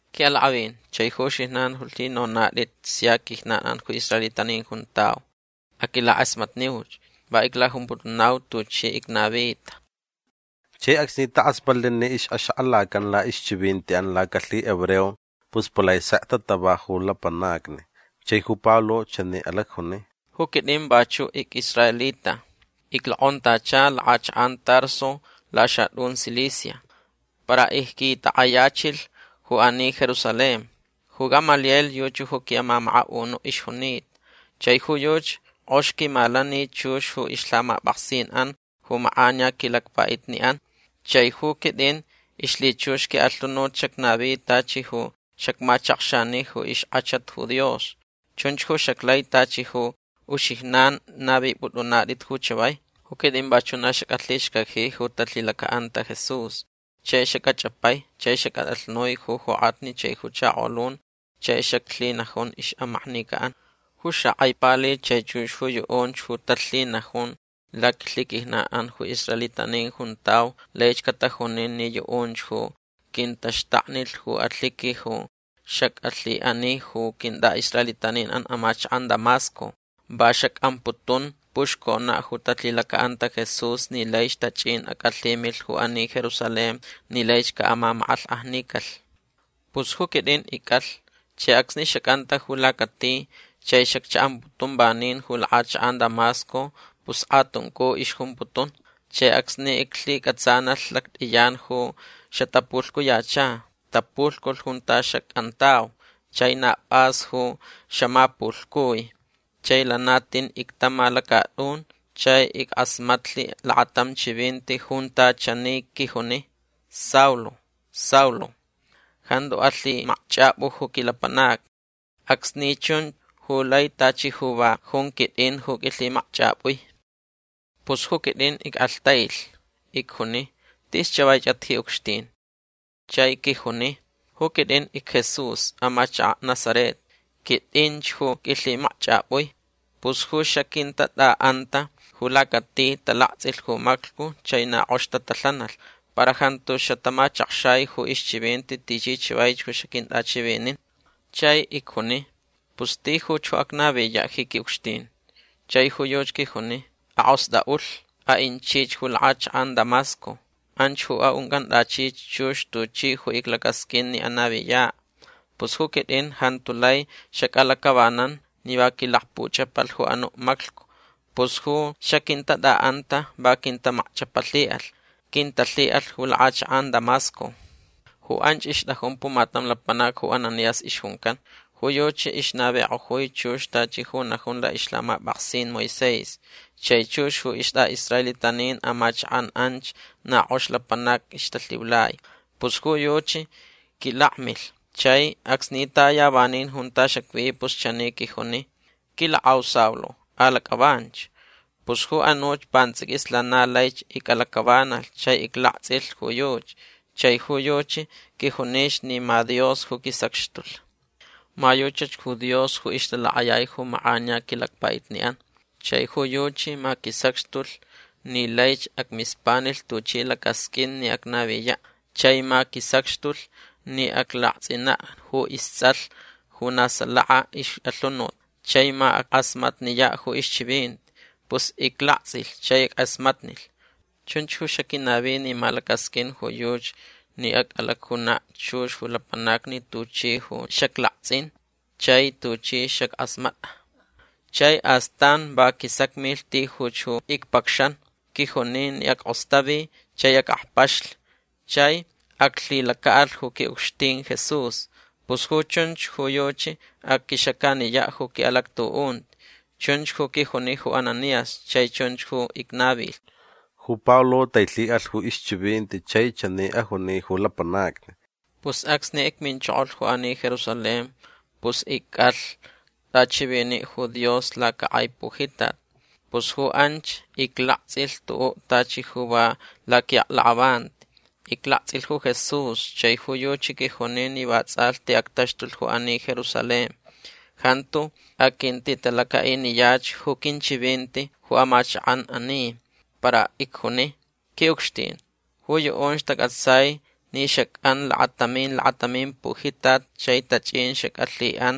―Qui'alak'avin chai ju uxijnan ju lhinonat'it sia quijnan'an ju israelitanin juntau. Aquilak'asmatniuch. Va iclajumputunau tuchi icnavita. Chai acsni tak'asmatlh ni ix'axak'alacan la'ixchivinti'an lacalhihebreo pus palai sek tatava ju lapanacni. Chai ju Pablo chani alacjuni: ―Ju quit'in vachu' ic'israelita. Iclok'ontacha lak'achak'an Tarso laxat'un Cilicia. Para icquitak'ayachilh ju ani Jerusalén. Ju Gamaliel yuchi ju qui'amamaka'unu' ixjunita. Chai ju yuchi k'ox quimalani chux ju ixlhamap'aksin'an ju mak'aniya quilacpa'itni'an. Chai ju quit'in ixlhichux qui'alhunut xacnavi tachi ju xacmachakxani ju ixk'achat ju Dios. Chunch ju xaclai tachi ju uxijnan navip'ut'unat'it ju chavai. Ju quit'in vachu' na xac'alhixcaji ju talhilaca'anta Jesús. Chai xac'ach'apai chai xac'at'alhnui ju jok'atni chai ju chakolun chai xaclhinajun ixmaknica'an. Ju xak'ai pali chai chux ju yu'unch ju talhinajun laquilhiquijnan'an ju israelitanin juntau laich catajunin ni yu'unch ju quintaxtaknilh ju alhiqui ju xac'alhi'ani ju quint'a'israelitanin amachak'an Damasco. Va xac'amputun puxcona' ju talhilaca'anta Jesús ni laich tach'in ac'alhimilh ju ani Jerusalén ni laich ca'amamak'alhk'ajnicalh. Pus ju quit'in ic'alh. Chai acsni xac'anta ju lacati chai xaccha'amputun vanin ju lak'achak'an Damasco pus k'atuncu ixjumputun. Chai acsni iclhic'atsanalh lact'iyan ju xatapulhcuyacha. Tapulhculh junta xac'antau. Chai na p'as ju xamapulhcui. Chai lana tin ictama lacat'un chai ick'asmatlh lakatam chivinti junta chani quijuni: “Saulo. Saulo. Jantu alhimakch'ap'u ju quilapanacni. Acsni ch'un u lai tachi ju va jun quit'in ju q'uilhimakch'ap'ui”. Pus ju quit'in ick'alhtailh. Icjuni: “Tis chavaich'at ji ucxtin”. Chai quijuni: “Ju quit'in icJesús amachaka' Nazaret. Quit'inch ju q'uilhimakch'ap'ui”. Pus ju xaquintat'a'anta ju lacati talakts'ilh ju maclhcu chai na k'ox tatalhanalh. Para jantu xatamachakxai ju ixchivinti tichi chavaich ju xaquint'achivinin. Chai icjuni: “Pus tijuch ju acnaviya' ji qui'ucxtin”. Chai ju yuchi quijuni: “Ak'ost'a'ulh. A'inchich ju lak'achak'an Damasco. Anch ju a'unc'ant'achich chux tuchi ju iclacasq'uin ni anaviya'”. Pus ju quit'in jantu lai xac'alac'avanan ni va quilakpuch'apalh ju anu' maclhcu. Pus ju xaquintat'a'anta va quintamakch'apalhi'alh. Quintalhi'alh ju lak'achak'an Damasco. Ju anch ixt'ajun pumatam lapanac ju Ananías ixjuncan. Ju yuchi ixnavik'ojui chux tachi ju najun la'ixlhamap'aksin Moisés. Chai chux ju ist'a'israelitanin amachak'an anch na k'ox lapanac ixtalhiulai. Pus ju yuchi quilakmilh. Chai acsni taya vanin junta xacvi pus chani quijuni: “Quilak'au Saulo alac'avanch”. Pus ju anuch pants'iquis lana laich ic'alac'avanalh chai iclakts'ilh ju yuchi. Chai ju yuchi quijunich ni ma Dios ju quisacxtulh. Ma yuchach ju Dios ju ixtalak'ayai ju mak'aniya quilacpa'itni'an. Chai ju yuchi ma quisacxtulh ni laich acmispanilh tuchi lacasq'uin ni acnaviya'. Chai ma quisacxtulh ni aclakts'ina' ju ists'alh ju na salaka ix'alhunut. Chai ma ack'asmatniya' ju ixchivinti. Pus iclakts'ilh chai ick'asmatnilh. Chunch ju xaquinavi ni ma lacasq'uin ju yuchi ni ac'alacjuna' chux ju lapanacni tuchi ju xaclakts'in chai tuchi xack'asmat'a. Chai astan va quisacmilh tijuch ju icpacxan. Quijuni ni ack'ostavi chai ac'akpaxlh. Chai aclhilaca'alh ju qui'ucxtin Jesús. Pus ju chunch ju yuchi aquixacaniya' ju qui'alactu'unti. Chunch ju quijuni ju Ananías chai chunch ju icnavilh. Ju Pablo tailhi'alh ju ixchivinti chai chani ajuni ju lapanacni: ―Pus acsni icminchokolh ju ani Jerusalén pus ic'alh t'achivini' ju Dios lacak'ai pujitat. Pus ju anch iclakts'ilh tu'u' tachi ju va laqui'aklak'avanti. Iclakts'ilh ju Jesús chai ju yuchi quijuni ni va ts'alhti actaxtulh ju ani Jerusalén. Jantu aquintitalaca'iniyach ju quinchivinti ju amachak'an ani. Para icjuni: “Qui'ucxtin ju yu'unch tac'atsai ni xac'an lakatamin lakatamin pujitat chai tach'in xac'alhi'an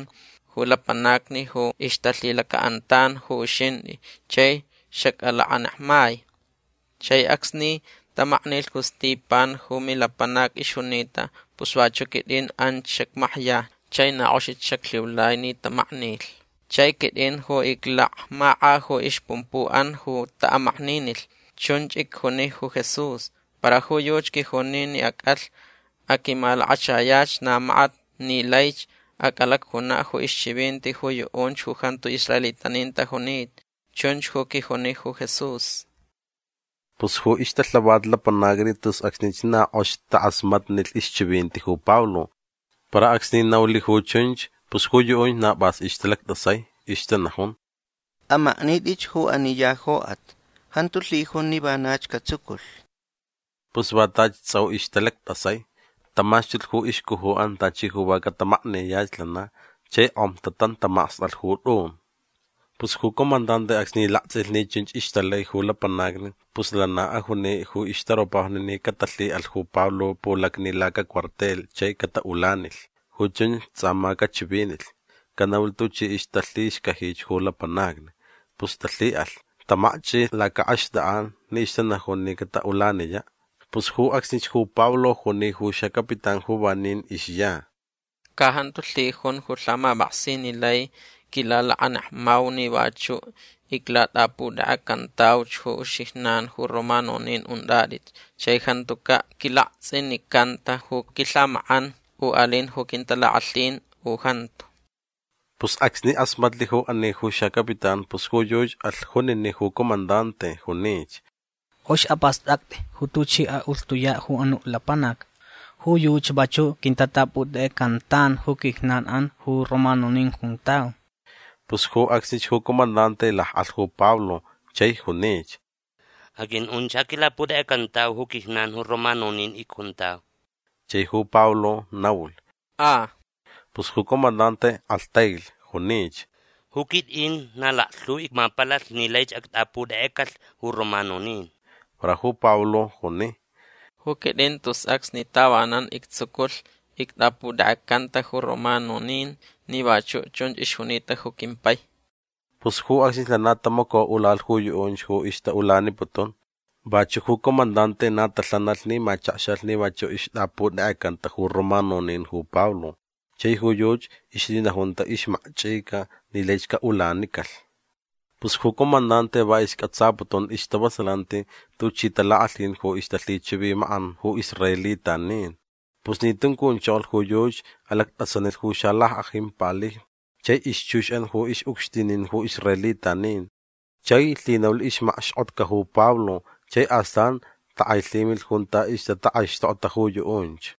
ju lapanacni ju ixtalhilaca'antan ju uxint'i chai xac'alakanekmai. Chai acsni tamaknilh ju Stipan ju milapanac ixjunita pus vachu' quit'in anch xacmakya chai na k'oxich xaclhiulai ni tamaknilh. Chai quit'in ju iclakmak'a ju ixpumpu'an ju ta'amakninilh”. Chunch icjuni ju Jesús. Para ju yuchi quijuni ni ac'alh. Aquimalakachayach na makat ni laich ac'alacjuna' ju ixchivinti ju yu'unch ju jantu israelitanin tajunita. Chunch ju quijuni ju Jesús. Pus ju ixtalhavat lapanacni tus acsnich na k'ox tak'asmatnilh ixchivinti ju Pablo. Para acsni naulh ju chunch pus ju yu'unch na p'as ixtalact'asai. Ixtanajun: ―Amaknit'ich ju ani ya jok'at. Jantuch lhijun ni vanach catsuculh. Pus va tachi ts'au ixtalact'asai. Tamaxtulh ju ixcuju'an tachi ju va catamakniyach lana chai k'om tatantamacst'alh ju t'un. Pus ju comandante acsni lakts'ilh ni chunch ixtalai ju lapanacni pus lana ajuni ju ixtaropajni ni catalhi'alh ju Pablo pulacni lacacuartel chai cata'ulanilh. Ju chunch ts'a ma cachivinilh. Canaulh tuchi ixtalhixcajich ju lapanacni. Pus talhi'alh. Tamakch'ilh laca'axt'ak'an ni ixtanajun ni cata'ulaniya'. Pus ju acsnich ju Pablo juni ju xacapitán ju vanin ixya: ―Ca jantu lhijun ju lhamap'aksin ni lai quilalakanekmau ni vachu' iclat'aputek'ecantauch ju uxijnan ju romanonin unt'at'it chai jantuca' quilakts'inicanta ju quilhamak'an u alin ju quintalak'alhin u jantu. Pus acsni k'asmatlh ju ani ju xacapitán pus ju yuchi alh junini' ju comandante. Junich: ―K'ox ap'ast'act'i ju tuch'i a'ulht'uya' ju anu' lapanac. Ju yuchi vachu' quintat'aputek'ecantan ju quijnan'an ju romanonin juntau. Pus ju acsnich ju comandante lak'alh ju Pablo chai junich: ―Aq'ui'unch. Ja quilat'aputek'ecantau ju quijnan ju romanonin icjuntau. Chai ju Pablo naulh: ―A. Pus ju comandante k'alhtailh. Junich: ―Ju quit'in na laklhu icmapalalh ni laich act'aputek'ecalh ju romanonin. Para ju Pablo juni: ―Ju quit'in tus acsni tavanan ictsuculh ict'aputek'ecanta ju romanonin ni vachu' chunch ixjunita ju quimpai. Pus ju acsnich lana tamaco'ulalh ju yu'unch ju ixta'ulaniputun. Vachu' ju comandante na talhanalh ni machakxalh ni vachu' ixt'aputek'ecanta ju romanonin ju Pablo chai ju yuchi ixlhinajunta ixmakch'ica ni laich ca'ulanicalh. Pus ju comandante va isc'atsaputun istavasalanti tuchi talak'alhin ju ixtalhichivimak'an ju israelitanin. Pus ni tuncunchokolh ju yuchi alact'asanilh ju xalack'ajin palijni chai ixchux'an ju ix'ucxtinin ju israelitanin. Chai lhinaulh ixmakxk'otca ju Pablo chai astan tak'ailhimilh junta ixtatak'aixtokta ju yu'unch.